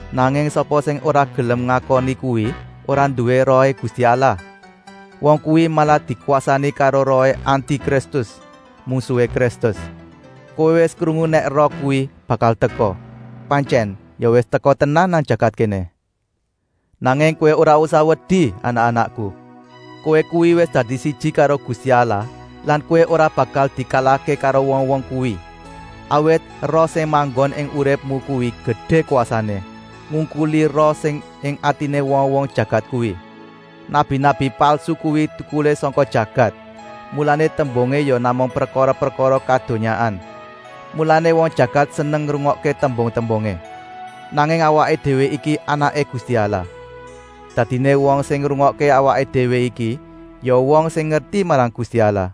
Nanging sapa sing ora gelem ngakoni kuwi ora nduwé Rohé Gusti Allah. Wong kuwi malah dikwasani karo rohé Anti-Kristus, mungsuhé Kristus. Kowé wis krungu nèk roh kuwi bakal teka; pantyèn ya wis teka tenan nang jagat kéné. Nanging kowé ora usah wedi anak-anakku! Kowé kuwi wis dadi siji karo Gusti Allah lan kowé ora bakal dikalahké karo wong-wong kuwi, awit Roh sing manggon ing uripmu kuwi gedé kwasané, ngungkuli roh sing ing atiné wong-wong jagat kuwi. Nabi-nabi palsu kuwi tukulé sangka jagat, mulané tembungé ya namung prekara-prekara kadonyaan. Mulané wong jagat seneng ngrungokké tembung-tembungé. Nanging awaké déwé iki anaké Gusti Allah. Dadiné wong sing ngrungokké awaké déwé iki ya wong sing ngerti marang Gusti Allah.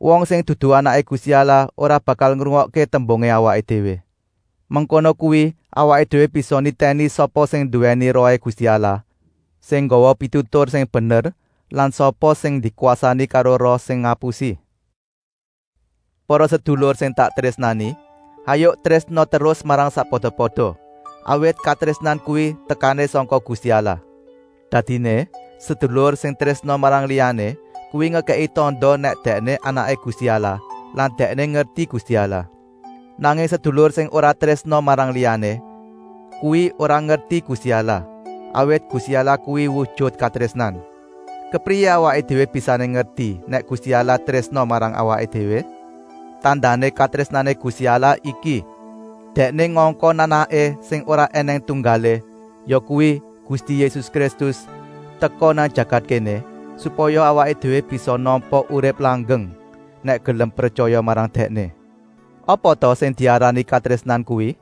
Wong sing dudu anaké Gusti Allah ora bakal ngrungokké tembungé awaké déwé. Mengkono kuwi awaké déwé bisa nitèni sapa sing nduwèni Rohé Gusti Allah, sing nggawa pitutur sing bener lan sapa sing dikwasani karo roh sing ngapusi. Para sedulur sing tak trésnani, hayuk trésna terus marang sakpada-pada, awit katrésnan kuwi tekané sangka Gusti Allah. Dadiné, sedulur sing trésna marang liyané kuwi ngekèki tanda nèk dèkné anaké Gusti Allah lan dèkné ngerti Gusti Allah. Nanging sedulur sing ora trésna marang liyané kuwi ora ngerti Gusti Allah, awit Gusti Allah kuwi wujut katrésnan. Kepriyé awaké déwé bisané ngerti nèk Gusti Allah trésna marang awaké déwé. Tandané katrésnané Gusti Allah iki: Dèkné ngongkon Anaké sing ora ènèng tunggalé, yakuwi Gusti Yésus Kristus, teka nang jagat kéné, supaya awaké déwé bisa nampa urip langgeng, nèk gelem pretyaya marang Dèkné. Apa ta sing diarani katrésnan kuwi?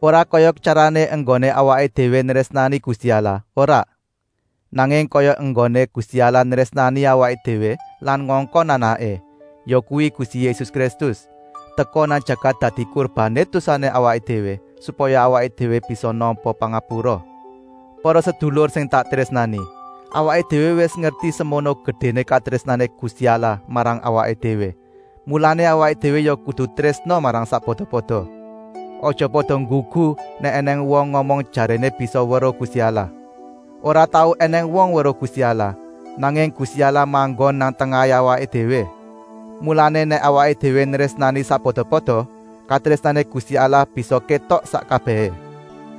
Ora kaya tyarané enggoné awaké déwé nrésnani Gusti Allah, ora, nanging kaya enggoné Gusti Allah nrésnani awaké déwé lan ngongkon Anaké, yakuwi Gusti Yésus Kristus, teka nang jagat dadi kurbané dosané awaké déwé, supaya awaké déwé bisa nampa pangapura. Para sedulur sing tak trésnani, awaké déwé wis ngerti semono gedéné katrésnané Gusti Allah marang awaké déwé, mulané awaké déwé ya kudu trésna marang sakpada-pada. (Aja pada nggugu, nèk ènèng wong ngomong jaréné bisa weruh Gusti Allah.) Ora tau ènèng wong weruh Gusti Allah, nanging Gusti Allah manggon nang tengahé awaké déwé. Mulané nèk awaké déwé nrésnani sakpada-pada, katrésnané Gusti Allah bisa kétok sak kabèhé.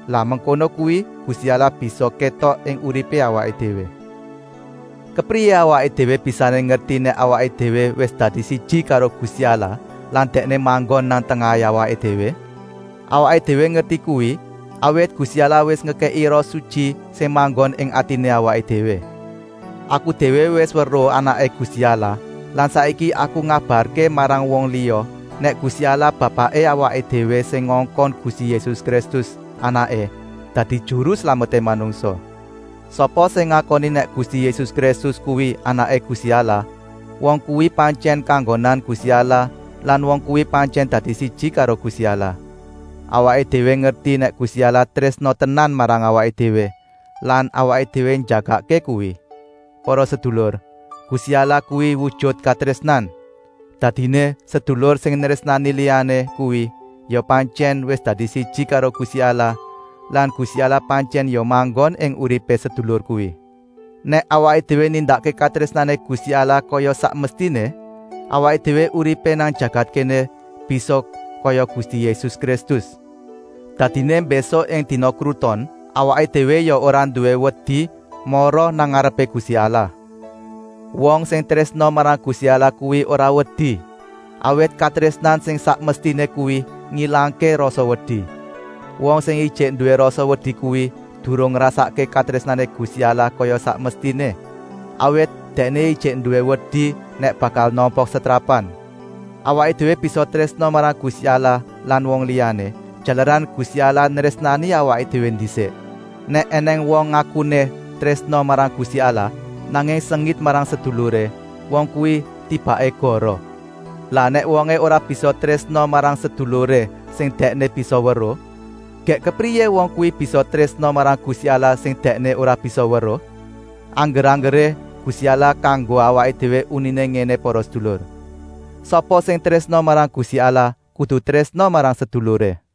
(Lah mengkono kuwi Gusti Allah bisa kétok ing uripé awaké déwé.) Kepriyé awaké déwé bisané ngerti nèk awaké déwé wis dadi siji karo Gusti Allah lan Dèkné manggon nang tengahé awaké déwé? Awaké déwé ngerti kuwi, awit Gusti Allah wis ngekèki Roh Sutyi sing manggon ing atiné awaké déwé. Aku déwé wis weruh Anaké Gusti Allah lan saiki aku ngabarké marang wong liya nèk Gusti Allah Bapaké awaké déwé sing ngongkon Gusti Yésus Kristus, Anaké, dadi Juru Slameté manungsa. Sapa sing ngakoni nèk Gusti Yésus Kristus kuwi Anaké Gusti Allah, wong kuwi pantyèn kanggonan Gusti Allah lan wong kuwi pantyèn dadi siji karo Gusti Allah. Awaké déwé ngerti nèk Gusti Allah trésna tenan marang awaké déwé lan awaké déwé njagakké kuwi. Para sedulur, Gusti Allah kuwi wujut katrésnan. Dadiné sedulur sing nrésnani liyané kuwi ya pantyèn wis dadi siji karo Gusti Allah lan Gusti Allah pantyèn ya manggon ing uripé sedulur kuwi. Nèk awaké déwé nindakké katrésnané Gusti Allah kaya sak mestiné, awaké déwé uripé nang jagat kéné bisa kaya Gusti Yésus Kristus. Dadiné mbésuk ing dina kruton awaké déwé ya ora nduwé wedi mara nang ngarepé Gusti Allah. Wong sing trésna marang Gusti Allah kuwi ora wedi, awit katrésnan sing sak mestiné kuwi ngilangké rasa wedi. Wong sing ijik nduwé rasa wedi kuwi durung ngrasakké katrésnané Gusti Allah kaya sak mestiné, awit dèkné ijik nduwé wedi nèk bakal nampa setrapan. Awaké déwé bisa trésna marang Gusti Allah lan wong liyané, jalaran Gusti Allah nrésnani awaké déwé ndisik. Nèk ènèng wong ngakuné trésna marang Gusti Allah, nanging sengit marang seduluré, wong kuwi tibaké goroh. Lah nèk wongé ora bisa trésna marang seduluré sing dèkné bisa weruh, gèk kepriyé wong kuwi bisa trésna marang Gusti Allah sing dèkné ora bisa weruh? Angger-anggeré Gusti Allah kanggo awaké déwé uniné ngéné para sedulur: “Sapa sing trésna marang Gusti Allah kudu trésna marang seduluré.”